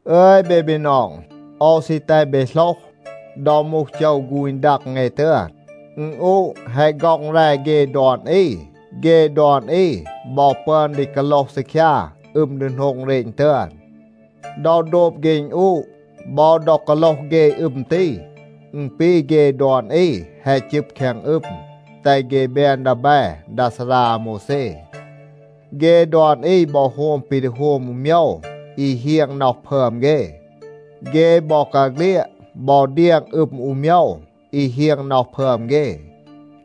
อึย เบ บีนอง, โอว ซี แตห เบ โหลห, ดอ มูห โจว ฆูณ ดัง เอ ตึอน, อึณอูะ แฮะ ฆ็อง แร เฆ ดอน อี. เฆ ดอน อี บอ ปึอน ดี กาโลห ซีคยา อึม ดีโหนง เรณ ตึอน. ดอ โดบ เฆ อึณอูะ บอ ดอ กาโลห เฆ อึม ตี, อึณ ปี เฆ ดอน อี แฮะ จึบ แคง อึม, แตห เฆ แบน ดีแบ ดา ซารา อาโมวแซ. เฆ ดอน อี บอ โฮม ปี ดี โฮม อู โมยว อี เฮียง น็อห พึอม เฆ. เฆ บอกาเฆลียด บอ เดียง อึม อู โมยว อี เฮียง น็อห พึอม เฆ.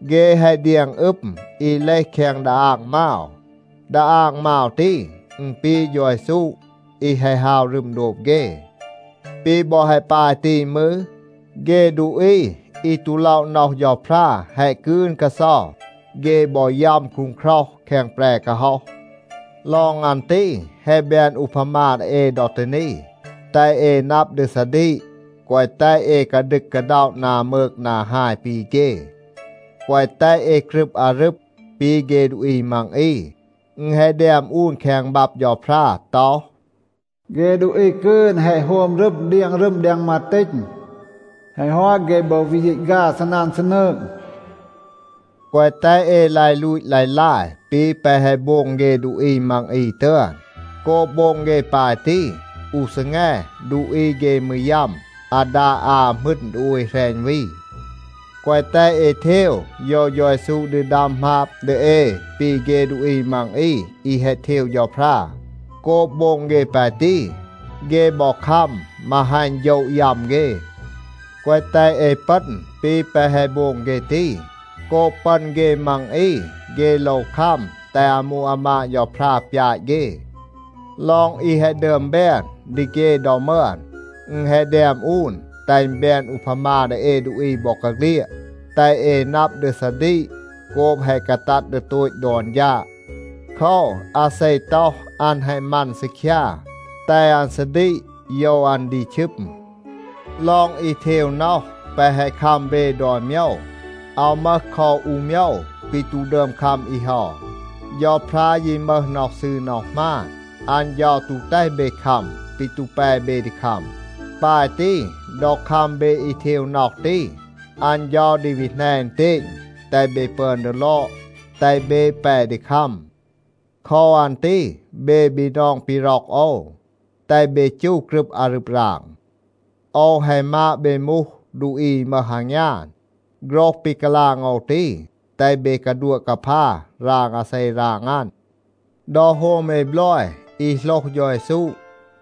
เฆ แฮะ เดียง อึม อี เลห แคง ดาอาง มาว. ดาอาง มาว ตี, อึณ ปี เฌา เยซู อี แฮะ ฮาว รึม โดบ เฆ. ปี บอ แฮะ ปาย ตี มืร, เฆ ดูอี อี ตู ล็อะ น็อห เฌาพรา แฮะ กืน กาเซา. เฆ บอ ยัม คูงคร็อห แคง แปร กาฮ็อห. ลอง อัน ตี, แฮะ แบน อูพามา ดี เอ ดอ ตี นี, แตห เอ นับ ดี ซาดีก, แกวะ แตห เอ กาดึก กาด็อะ นา มืก นา ฮาย ปี เฆ. แกวะ แตห เอ กรึบ อารึบ ปี เฆ ดูอี มัง อี. อึณ แฮะ แดม อูน แคง บับ เฌาพรา ต็อห, “เฆ ดูอี กืน แฮะ โฮม รึม เดียง รึม แดง มาตีณ. แฮะ ฮอต, เฆ บอ วี ยีต ฆา ซีนัน ซีนืง.” แกวะ แตห เอ ลาย ลูต ลาย ลาย ปี แปะ แฮะ โบง เฆ ดูอี มัง อี ตึอน. โกบ โบง เฆ ปาย ตี, อู ซีแง ดูอี เฆ มืร ยัม อาดา อา หมึณ ดี โอย แหรณ วี. แกวะ แตห เอ เทว โยว เฌา เยซู ดี ดัม หมาบ ดี เอ ปี เฆ ดูอี มัง อี อี แฮะ เทว เฌาพรา. โกบ โบง เฆ ปาย ตี, เฆ บอ คัม มาฮัณ โฌะ ยัม เฆ. แกวะ แตห เอ ปึณ ปี แปะ แฮะ โบง เฆ ตี. โกบ ปึณ เฆ มัง อี, เฆ โลว คัม แตห อามู อามาด เฌาพรา ปยาต เฆ. ลอง อี แฮะ ดึอม แบน ดี เฆ ดอ มึอน, อึณ แฮะ แดม อูน, แตห อึณ แบน อูพามา ดี เอ ดูอี บอกาเฆลียด. แตห เอ นับ ดี ซาดีก โกบ แฮะ กาตัด ดี โตต ดอน ฌาด. โคว, อาเซ ต็อห, อัน แฮะ มัน ซีคยา, แตห อัน ซาดีก โยว อัน ดี ชึม. ลอง อี เทว น็อห แปะ แฮะ คัม เบ ดอน โมยว, อาว มึห คอ อู โมยว, ปี ตู ดึอม คัม อี เฮา. เฌาพรา ยี มึห น็อห ซืร น็อห หมาน. อัน เฌา ตู แตห เบ คัม ปี ตู แป เบ ดี คัม. ปาย ตี, ดอ คัม เบ อี เทว น็อห ตี, อัน เฌา ดี วี แหน อึณเตณ, แตห เบ ปึอน ดี ลอด, แตห เบ แป ดี คัม. โคว อัน ตี เบ บีนอง ปี ร็อก โอว, แตห เบ จู กรึบ อารึบ ราง. โอว แฮะ มาด เบ มูห ดูอี อี มึห อางยาน. โฆรห ปี กาลาง โอว ตี, แตห เบ กาดัวะ กาพา ราง อาเซ ราง อัน. ดอ โฮม เอ บลอย อี โหลห เฌา เยซู,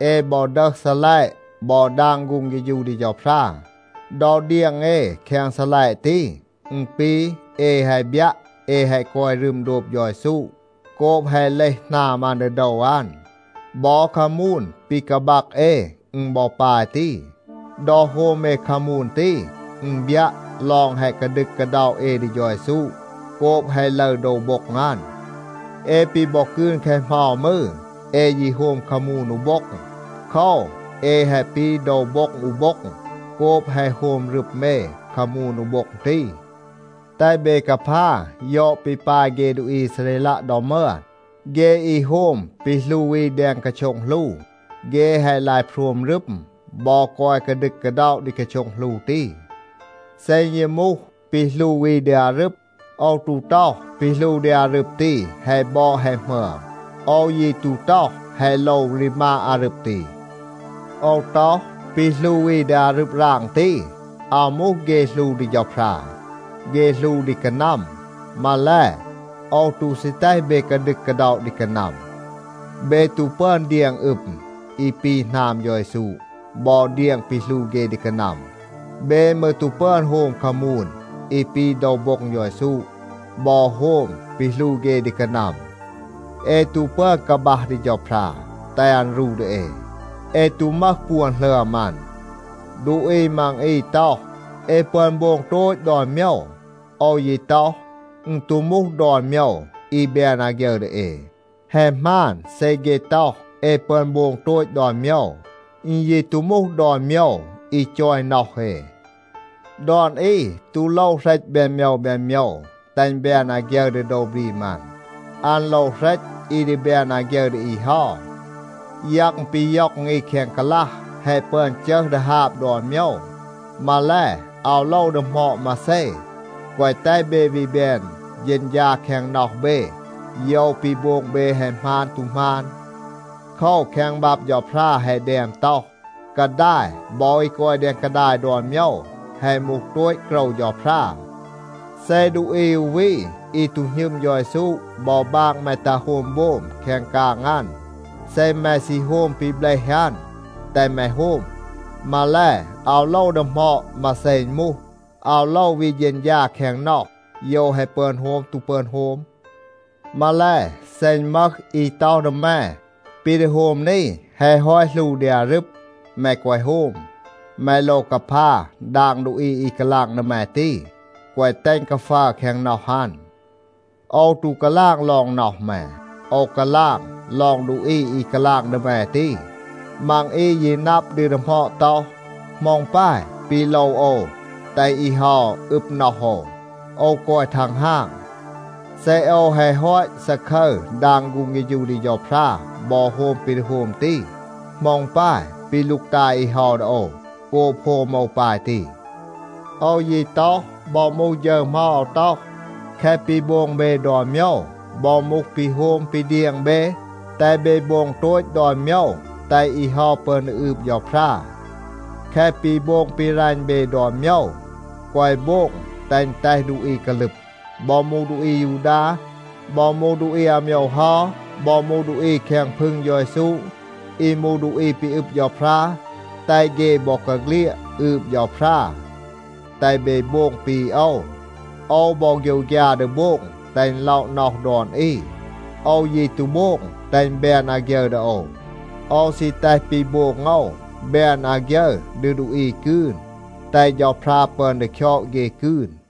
เอ บอ ดึห ซีลัยะ บอ ดาง ฆูง เฆฌู ดี เฌาพรา. ดอ เดียง เอ แคง ซีลัยะ ตี, อึณ ปี เอ แฮะ บยัะ เอ แฮะ กอย รึม โดบ เฌา เยซู โกบ แฮะ เลห หนาม อัน ดี โดว อัน. บอ คามูน ปี กาบัก เอ, อึณ บอ ปาย ตี. ดอ โฮม เอ คามูน ตี, อึณ บยัะ ลอง แฮะ กาดึก กาด็อะ เอ ดี เฌา เยซู โกบ แฮะ ลึร โดว โบ็ง อัน. เอ ปี บอ กืน แคะ เหมา มืร, เอ ยี โฮม คามูน อู โบ็ง. โคว, เอ แฮะ ปี โดว โบ็ง อู โบ็ง โกบ แฮะ โฮม รึม เอ คามูน อู โบ็ง ตี. แตห เบ กาพา ยอด ปี ปาย เฆ ดูอี อีซาเรลัะ ดอ มึอน. เฆ อี โฮม ปี หลู อี แดง กาโช็ง หลู, เฆ แฮะ ลาย โพรม รึม บอ กอย กาดึก กาด็อะ ดี กาโช็ง หลู ตี. เซ อึณ ยี มูห ปี หลู อี ดี อารึบ, โอว ตู ต็อห, ปี หลู ดี อารึบ ตี แฮะ บอด แฮะ หมึอม. โอว ยี ตู ต็อห, แฮะ โลว รีมาด อารึบ ตี. โอว ต็อห, ปี หลู อี ดี อารึบ ราง ตี, อาว มูห เฆ หลู ดี เฌาพรา. เฆ หลู ดี กานัม. มาแล, โอว ตู ซี แตห เบ กาดึก กาด็อะ ดี กานัม. เบ ตู ปึอน เดียง อึม อี ปี หนาม เฌา เยซู บอ เดียง ปี หลู เฆ ดี กานัม. เบ มืร ตู ปึอน โฮม คามูน อี ปี โดว โบ็ง เฌา เยซู บอ โฮม ปี หลู เฆ ดี กานัม. เอ ตู ปึอน กาบัห ดี เฌาพรา, แตห อัน รู ดี เอ. เอ ตู มึห ปวน หลึอม อัน. ดูอี มัง อี ต็อห, “เอ ปึอน โบง โตต ดอน โมยว.” โอว ยี ต็อห, อึณ ตู มูห ดอน โมยว อี แบน อาฆยึร ดี เอ. แฮะ หมาน เซ เฆ ต็อห, “เอ ปึอน โบง โตต ดอน โมยว.” อึณ ยี ตู มูห ดอน โมยว อี จอย น็อห เอ. ดอน อี ตู โลว เหรต แบน โมยว แบน โมยว, แตห อึณ แบน อาฆยึร ดี โดว บรีม อัน. อัน โลว เหรต อี ดี แบน อาฆยึร ดี อี เฮา. ยัง ปี ย็อง อี แคง กาลัห, แฮะ ปึอน จึห ดี ฮาบ ดอน โมยว. มาแล, อาว โลว ดีหมอด มาเซ, แกวะ แตห เบ วี แบน เฌณฌา แคง น็อห เบ โยว ปี โบง เบ แฮะ หมาน ตู หมาน. โคว, แคง บับ เฌาพรา แฮะ แดม ต็อห, “กาดาย บอ อี กอย แดง กาดาย ดอน โมยว, แฮะ มูห โตต โกรว เฌาพรา.” เซ ดูอี อู วี อี ตู หณึม เฌา เยซู บอ บาง แม ตัห โฮม โบม แคง กาง อัน, เซ แม ซี โฮม ปี เบลห อัน, แตห แม โฮม. มาแล, อาว โลว ดีหมอด มาเซ อึณ มูห, อาว โลว วี เฌณฌา แคง น็อห, โยว แฮะ ปึอน โฮม ตู ปึอน โฮม. มาแล, เซ อึณ มึห อี ต็อห ดี แม, “ปี ดี โฮม นี, แฮะ ฮอต หลู ดี อารึบ,” แม แกวะ โฮม. แม โลว กาพา ดาง ดูอี อี กาลาง ดี แม ตี, แกวะ แตห อึณ กาฟัร แคง น็อห อัน. โอว ตู กาลาง ลอง น็อห แม. โอว กาลาง ลอง ดูอี อี กาลาง ดี แม ตี. มัง อี ยี นับ ดี ดีหมอด ต็อห, “เหมา อึณ ปาย ปี โลว โอว แตห อี เฮา อึบ น็อห โอว? โอว กอย ทังฮาง. เซ โอว แฮะ ฮอต ซาคึร ดาง ฆูง เฆฌู ดี เฌาพรา บอ โฮม ปี ดี โฮม ตี, เหมา อึณ ปาย ปี ลูกตาย อี เฮา ดี โอว โกบ โฮม โอว ปาย ตี?” โอว ยี ต็อห, บอ มูห ฌึร เหมา อาว ต็อห, แคะ ปี โบง เบ ดอน โมยว, บอ มูห ปี โฮม ปี เดียง เบ, แตห เบ โบง โตต ดอน โมยว, แตห อี เฮา ปึอน ดี อืบ เฌาพรา. แคะ ปี โบง ปี รัณ เบ ดอน โมยว, แกวะ โบง แตห อึณ แตห ดูอี กาลึบ. บอ มูห ดูอี อายูดา, บอ มูห ดูอี อาโมยว เฮา, บอ มูห ดูอี แคง พึง เฌา เยซู อี มูห ดูอี ปี อึบ เฌาพรา, แตห เฆ บอกาเฆลียด อืบ เฌาพรา. แตห เบ โบง ปี โอว. โอว บอ โฆยวฆยา ดี โบง แตห อึณ ล็อะ น็อห ดอน อี. โอว ยี ตู โบง แตห อึณ แบน อาฆยึร ดี โอว. โอว ซี แตห ปี โบง โอว แบน อาฆยึร ดี ดูอี กืน, แตห เฌาพรา ปึอน ดี คยอด เฆ กืน.